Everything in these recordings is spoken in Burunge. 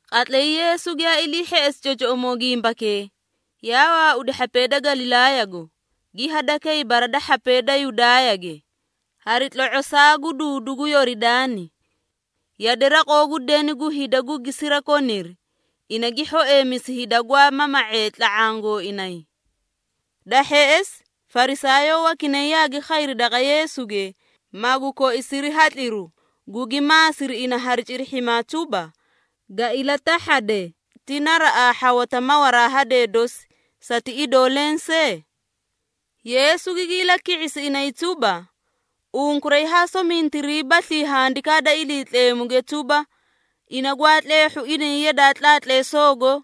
Qatlay Yeesu giyaa ilii hheꞌesi cocoꞌomoo gimbakee, yaa waaudi hhapee da Galilaayago, gi hadakay bara da hhapee da Yudaayage, hari tlo⁄osaa gu duudu gu Yoridaani. Yade raqoo gu deni gu hida gugi sirakoniri, ina gi hhoeemisi hida gwaa mama⁄ee tla⁄aã gooinay. Da hheꞌesi, Farisaayoo wakinay yaagi khayri daqa Yeesuge, magu koisiri hatliru, gugi maasiri ina hari cirihhimaa tuba, “Ga ilatahhade, ti naraꞌaa hhawata mawaraa hadee dosi, sati idoo lensee?” Yeesu gigi ilaki⁄isi inay tuba, “Unkuray haa somintiriibaslii Handikaa da Iliitleemuge tuba, ina gwaa tleehhu inay yadaa tlaatleesoogo,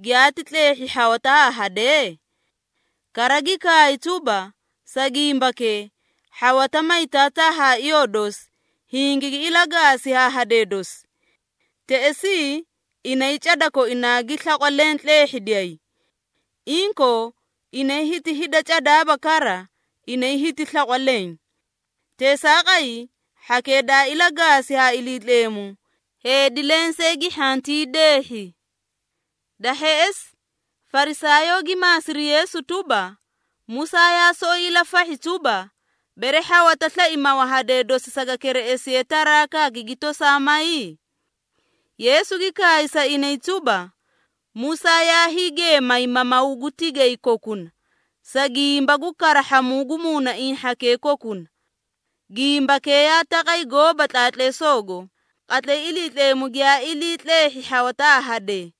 ‘giyaati tleehhi hhawata haa hadee’? Kara gi kaay tuba, ‘Sa gimbakee, hhawata may taataa haa iyoo dosi, hingigi ilagaasi haa hadee dosi. Teꞌesii inay cada koinaa gi slaqwa leẽ tleehhidiyay.’ Inkoo, inay hiti hida cadaaba kara, inay hiti slaqwa leẽ. Teesaaqay, hhakee daa ilagaasi ha Iliitleemu, heedi lensee gi hhantii deehhi.” Da hheꞌesi, Farisaayoo gi maasiri Yeesu tuba, “Musaa yaa soꞌoyi ilafahhi tuba, bere hhawata slai mawa hadee dosi saga kereꞌesiye tarakaa, gigi tosaa may?” Yeesu gi kaay sa inay tuba, “Musaa yaa hiigeemay mamawu gu tigay kokuna, sa gimba gu karahhamuu gu muunaiĩ hhakee kokuna. Gimbakee yaa taqay gooba tlaatleesoogo, qatlay Iliitleemu giyaa ilii tleehhi hhawata haa hadee.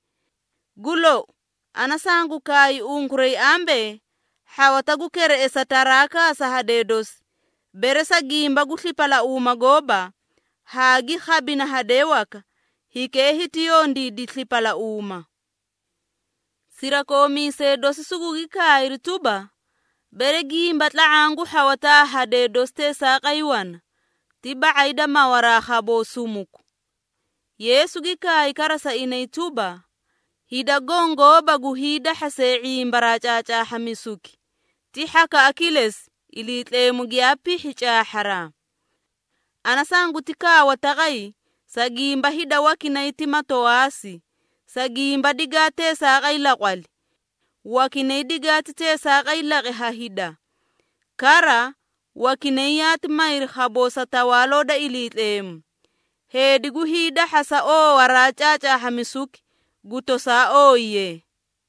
Gu lou, ana sangu kaay unkuray ambee, hhawata gu kereꞌesa tarakaa sa hadee dosi, bere sa gimba gu slipalauuma gooba, haa gi khabina hadee waka, hikee hiti yondiidi slipalauuma.” Sirakoomiisee dosi sugugi kaayri tuba, “Bere gimba tla⁄aã gu hhawata haa hadee dosi teesaaqay wana, ti ba⁄ay da mawaraa khaboo sumuku.” Yeesu gi kaay kara sa inay tuba, “Hida goõ gooba gu hiidahhasee ⁄imbaraa caacaahhamisuki, ti hhakaꞌa kilesi, Iliitleemu giyaa pihhi caahharaa. Ana sanguti kaawa taqay, sa gimba hida wakinay ti matowaasi, sa gimba digaa teesaaqay laqwali. Wakinay digaati teesaaqay laqi ha hida. Kara, wakinay yaati mayri khaboo sa Tawaaloo da Iliitleemu. Heedi gu hiidahhasa oowaraa caacaahhamisuki, gu tosaa ooyiye.”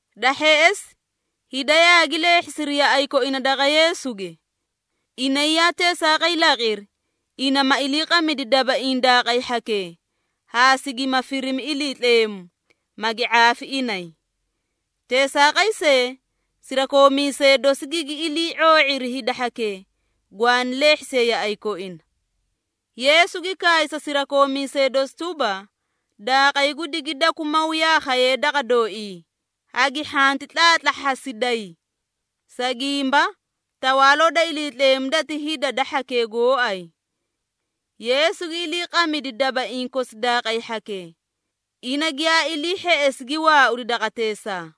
Da hheꞌesi, hida yaagi leehhisiri yaꞌay koina daqa Yeesuge. Inay yaa teesaaqay laqiri, ina ma iliiqamidi dabaiĩ daaqay hhakee, haa sigima firimi iliitleemu, magi ⁄aafi inay. Teesaaqay see, sirakoomiisee dosi gigi ilii ⁄oo⁄iri hida hhakee, gwaani leehhisee yaꞌay koina. Yeesu gi kaay sa sirakoomiisee dosi tuba, “Daaqay gu digidakwi maw yaa khayee daqa dooii, hagi hhanti tlaatlahhasiday. Sa gimba, Tawaaloo da Iliitleemu dati hida da hhakee gooay.” Yeesu gi iliiqamidi dabaiĩ kosi daaqay hhakee. Ina giyaa ilii hheꞌesi gi waaudi daqateesaa.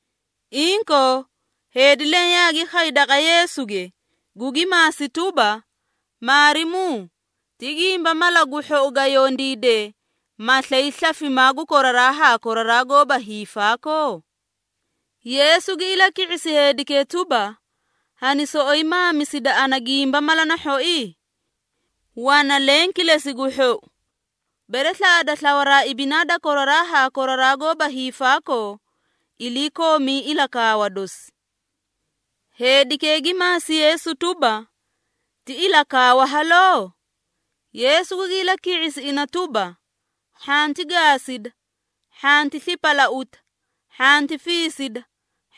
Inkoo, heedi leẽ yaagi khay daqa Yeesuge, gugi maasi tuba, “Maarimuu, ti gimba mala gu hhou ga yondiide, ma slay slafimaa gu koraraa haa koraraa goóba hiifaakoo?” Yeesu gi ilaki⁄isi heedikee tuba, “Hani soꞌoyi maamisida ana gimba mala na hhoi? Wana leẽ kilesi gu hhou. Bere slaꞌada slawaraa ibinaa da koraraa haa koraraa goóba hiifaakoo, iliikoomii ilakaawa dosi.” Heedikee gi maasi Yeesu tuba, “Ti ilakaawa haloo?” Yeesu gugi ilaki⁄isi ina tuba, “Hhanti gaasida, hhanti slipalauta, hhanti fiisida,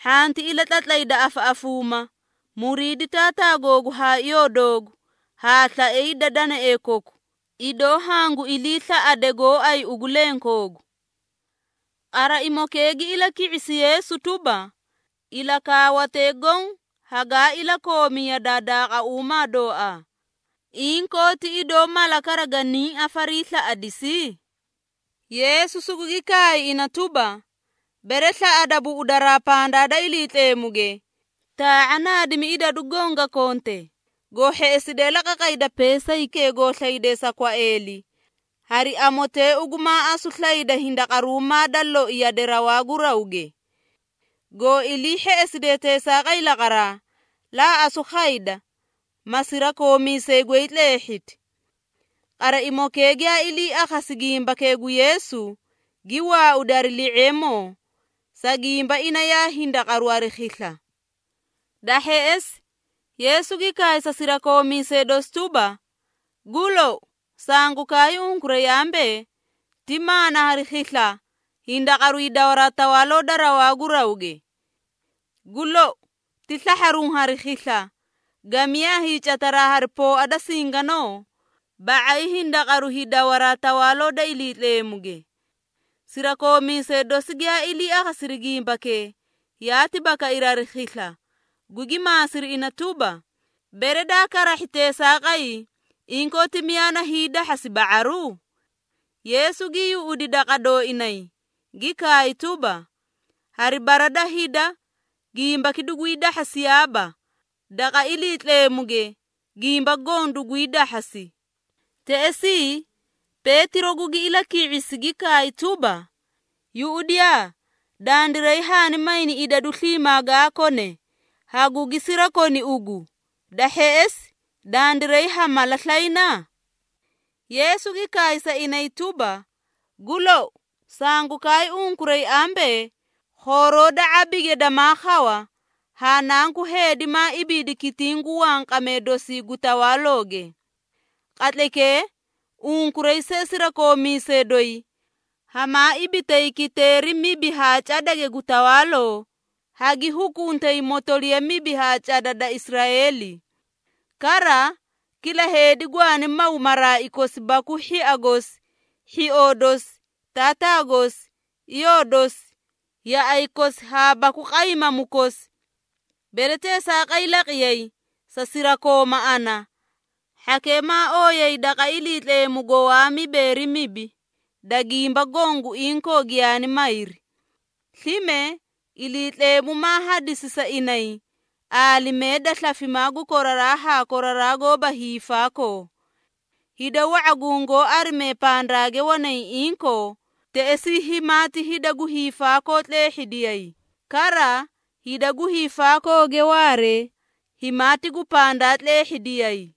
hhanti ilatlatlayda afaꞌafuuma, muriidi taataa googu haa iyoo doogu, haa ‘slae hida danaee koku, idoo hangu iliislaꞌade gooay ugu lenkoogu.’” Qaraimokee gi ilaki⁄isi Yeesu tuba, “Ilakaawatee goõ hagaa iliikoomi yadaa daaquumaa dooaa. Inkoo ti idoo mala kara ganiĩ afariislaꞌadisi?” Yeesu sugugi kaay ina tuba, “Bere slaꞌada buꞌudaraa pandaa da Iliitleemuge, taa⁄a naadimi idadu goõ ga konte, goo hheꞌeside la qaqayda peesaykee goo slayde sa kwaeeli, hari amotee ugu maa asu slayda hindaqaruumaa da loi yade rawaa gu rawge. Goo ilii hheꞌeside teesaaqay laqaraa, laa asu khayda, ma sirakoomiisay goy tleehhiti.” Qaraimokee giyaa ilii akhasi gimbakee gu Yeesu, gi waaudi hari li⁄eemoo, sa gimba ina yaa hindaqaru hari khisla. Da hheꞌesi, Yeesu gi kaay sa sirakoomiisee dosi tuba, “Gu lou, sangu kaay unkuray ambee, ti maana hari khisla, hindaqaru hidawaraa Tawaaloo da rawaa gu rawge. Gu lou, ti slahharuũ hari khisla, gamiyaa hiicataraa hari pooa da singanoo, ba⁄ay hindaqaru hiidawaraa Tawaaloo da Iliitleemuge.” Sirakoomiisee dosi giyaa ilii akhasiri gimbakee, yaati bakairi hari khisla, gugi maasiri ina tuba, “Bere daa karahhi teesaaqay, inkoo ti miyaa na hiidahhasi ba⁄aru?” Yeesu gi yuꞌudi daqa dooinay, gi kaay tuba, “Hari bara da hida gimbaki dugwii dahhasiyaaba, daqa Iliitleemuge gimba goõ dugwii dahhasi.” Teꞌesii, Peetiro gugi ilaki⁄isi, gi kaay tuba, “Yuꞌudiyaa, dandiray haani mayni idadu sliimaa gaa kone, hagugi sirakoni ugu. Da hheꞌesi, dandiray ha mala slayna?” Yeesu gi kaay sa inay tuba, “Gu lou, sangu kaay unkuray ambee khooroo da ⁄abige dama khawa, haa Nanku Heedi maa ibiidi kitiĩ gu wanqamee dosii gu tawaalooge. Qatlaykee, unkuray see sirakoomiisee doyi, hamaa ibitay kiteeri mibi haa cadage gu tawaaloo, hagi hukuntay motoliya mibi haa cada da Israeeli. Kara, kila heedi gwaani maw maraai kosi baku hhia gosi, hhioo dosi, taataa gosi, iyoo dosi, yaꞌay kosi haa baku qaymamu kosi. Bere teesaaqay laqiyay, sa sirakooma ana, hhakee maa ooyay daqa Iliitleemugo waa mibeeri mibi, da gimba goõ gu inkoo giyaani mayri. Slime, Iliitleemu maa hadisi sa inay, aalimee da slafimaa gu koraraa haa koraraa goóba hiifaakoo. Hida wa⁄a gungoó arimee pandaage wanay inkoo, teꞌesii himaati hida gu hiifaakoo tleehhidiyay, kara hida gu hiifaakooge waara, himaati gu pandaa tleehhidiyay.”